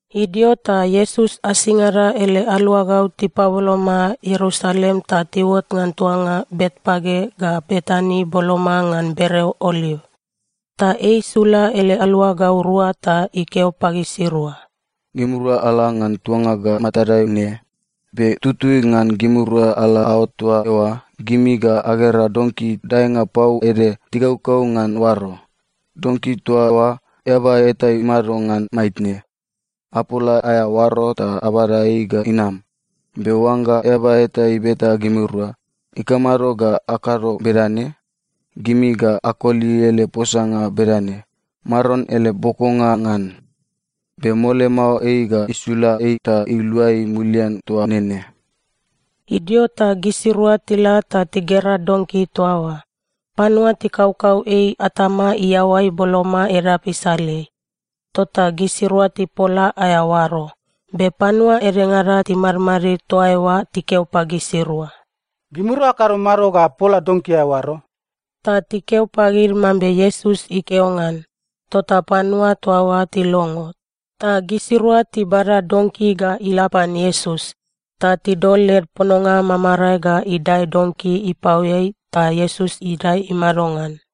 Idio ta Iesus asingada ele aluagau tipaboloma Ierusalem ta tiuot ngan tuanga Betpage ga Betani boloma ngan bereo Oliv. Ta ei isula ele aluagau rua ta ikeo pagisirua, “Gimirua ala ngan tuanga ga matadai ne. Be tutui ngan gimirua ala aot toa eoa, gimi ga agera donki daenga pau ede tikaukau ngan oaro. Donki toa oa, eaba eta imado ngan maitne. Apola aea oaro ta abada ei ga inam. Be oangga eaba eta ibeta gimirua, ‘Ikamado ga akado bedane?’ gimi ga akoli ele posanga bedane, ‘Maron ele bokonga ngan. Be mole mao ei ga isula ei ta iluai mulian toa nene.’” Idio ta gisirua tila ta tigera donki toa oa. Panua tikaukau ei atama iaoai boloma edap isaleai. Tota gisirua tipola aea oaro. Be panua edengada timadmadid toa eoa tikeo pagisirua, “Gimirua akado mado ga apola donki aea oaro?” Ta tikeo pagid mambe Iesus ikeo ngan. Tota panua toa oa tilongo, ta gisirua tibada donki ga ila pan Iesus. Ta tidol led pononga mamarae ga idae donki ipaoeai ta Iesus idae imado ngan.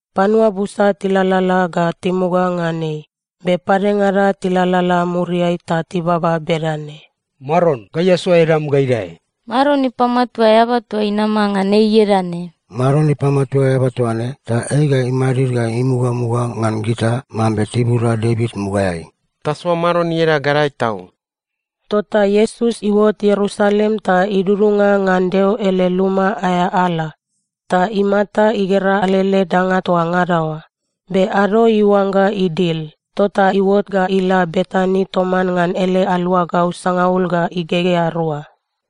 Panua busa tilalala ga timuga ngan ei, be padengada tilalala muriai ta tibaba bedane, “Maron, gai asoa edam ga idae! Maron ipamatua eaba toa inama ngan ei ieda ne!” “Maron ipamatua eaba toa ne, ta ei ga imadid ga imugamuga ngan gita mambe tibuda Devit mugaeai. Tasoa Maron ieda gadae tau!” Tota Iesus iuot Ierusalem ta idudunga ngan Deo ele luma aea ala, ta imata igera alele danga toa ngada oa. Be ado iuangga idil, tota iuot ga ila Betani toman ngan ele aluagau sangaul ga igegea rua.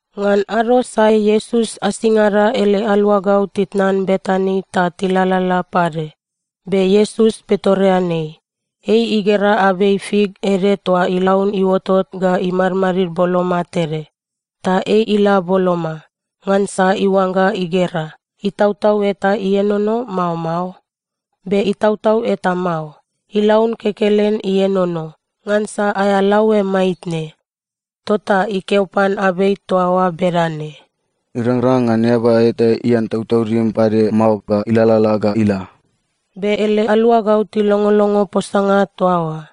Ngan ado sae Iesus asingada ele aluagau titnan Betani ta tilalala pade, be Iesus pitoreanei. Ei igera abei fik ede toa ilaun iuotot ga imadmadid boloma tede. Ta ei ila boloma, ngansa iuangga igera, itautau eta ienono, mao mao. Be itautau eta mao. Ilaun kekelen ienono, ngansa aea laoe maitne. Tota ikeo pan abei toa oa bedane, “Irangrang ngan eaba eta ian tautaudim pade mao ga ilalala ga ila.” Be ele aluagau tilongolongo posanga toa oa.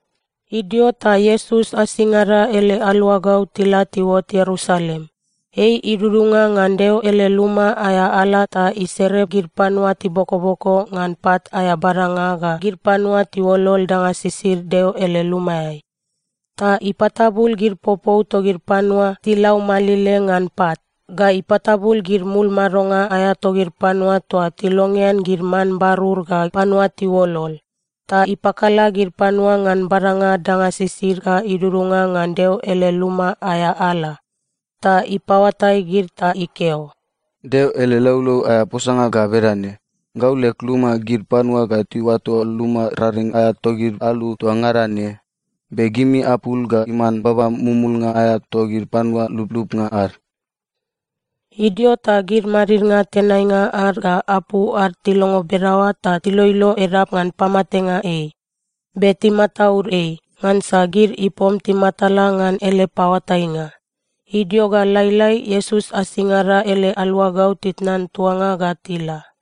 Idio ta Iesus asingada ele aluagau tila tiuot Ierusalem. Ei idudunga ngan Deo ele luma aea ala ta isere gid panua tibokoboko ngan pat aea badanga ga gid panua tiuolol danga sisid Deo ele lumaeai. Ta ipatabul gid popou togid panua tilaumalile ngan pat, ga ipatabul gid mul madonga aea togid panua toa tilongean gid man barur ga panua tiuolol. Ta ipakala gid panua ngan badanga danga sisid ga idudunga ngan Deo ele luma aea ala. Ta ipaoatai gid ta ikeo, “Deo ele laulau aea posanga ga bedane, “‘Gau leg luma, gid panua ga tiuato luma raring aea togid alu toa ngada ne.’ Be gimi apul ga iman baba mumulnga aea togid panua lublubnga ad.” Idio ta gid madidnga tenainga ad ga apu ad tilongo bedaoa ta tiloilo edap ngan pamatenga ei. Be timataud ei, ngansa gid ipom timatala ngan ele paoatainga. Idio ga lailai, Iesus asingada ele aluagau titnan tuanga ga tila.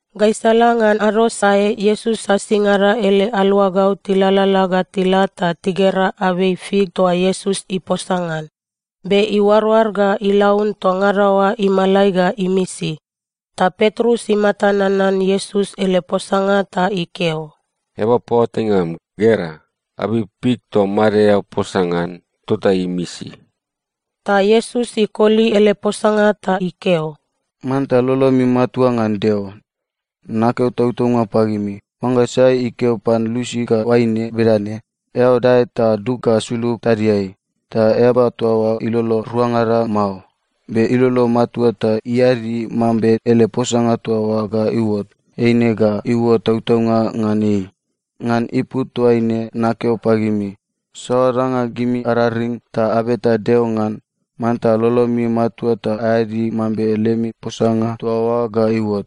Gaisala ngan ado sae Iesus asingada ele aluagau tilalala ga tila ta tigera abei fik toa Iesus iposa ngan. Be iuaroar ga ilaun toa ngada oa imalai ga imisi. Ta Petrus imata nanan Iesus ele posanga ta ikeo, “Eaba paoatainga am, gera. Abei fik toa made eao posa ngan, tota imisi!” Ta Iesus ikoli ele posanga ta ikeo, “Manta lolomi matua ngan Deo. Nakeo tautaunga pagimi, oangga sai ikeo pan lusi ga oaine bedane, ‘Eao dae ta dug ga sulug tadiai,’ ta eaba toa oa ilolo ruangada mao, be ilolo matua ta iadi mambe ele posanga toa oa ga iuot, eine ga iuot tautaunga ngan ei. Ngan ipu toaine nakeo pagimi, saoa danga gimi araring ta abeta Deo ngan, manta lolomi matua ta aeadi mambe lemi posanga toa oa ga iuot.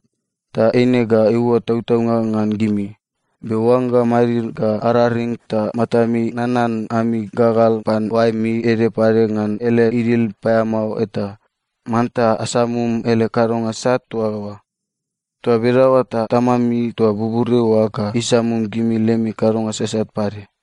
Ta eine ga iuot tautaunga ngan gimi. Be oangga amadid ga araring ta matami nanan ami gagal pan oaemi ede pade ngan ele idil paeamao eta, manta asamum ele kadonga sat toa oa. Toa bedaoa ta Tamami toa buburiai oa ga isamum gimi lemi kadonga sasat pade.”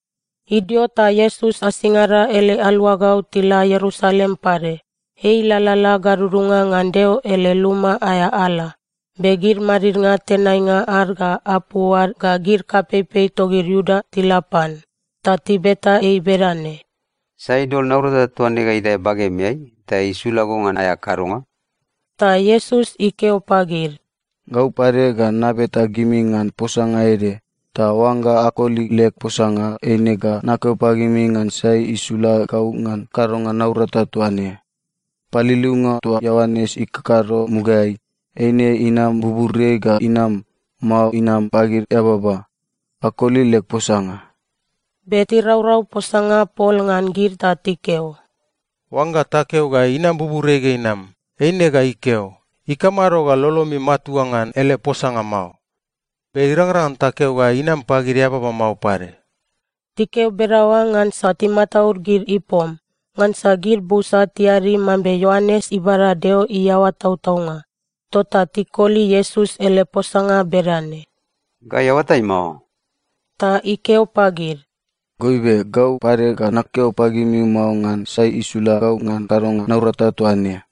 Idio ta Iesus asingada ele aluagau tila Ierusalem pade. Ei ilalala gadudunga ngan Deo ele luma aea ala, be gid madidnga tenainga ad ga apu ad ga gid kapeipei togid Iuda tila pan. Ta tibeta ei bedane, “Sai idol naurata toa ne ga idae bagemeai ta isula go ngan aea kadonga?” Ta Iesus ikeo pagid, “Gau pade ga nabeta gimi ngan posanga ede. Ta oangga akoli leg posanga, eine ga nakeo pagimi ngan sai isula gau ngan kadonga naurata toa ne. Paliliunga toa Ioanes ikakado mugaeai, eine inam buburiai ga inam, mao inam pagid eababa? Akoli leg posanga!” Be tiraurau posanga pol ngan gid ta tikeo, “Oangga takeo ga inam buburiai ga inam, eine ga ikeo, ‘Ikamado ga lolomi matua ngan ele posanga mao?’ Be irangrang ngan takeo ga inam pagid eababa mao pade.” Tikeo bedaoa ngansa timataud gid ipom, ngansa gid busa tiadi mambe Ioanes ibada Deo iaoa tautaunga. Tota tikoli Iesus ele posanga bedane, “Gai aoatai mao.” Ta ikeo pagid, “Goibe, gau pade ga nakeo pagimi mao ngan sai isula gau ngan kadonga naurata toa ne.”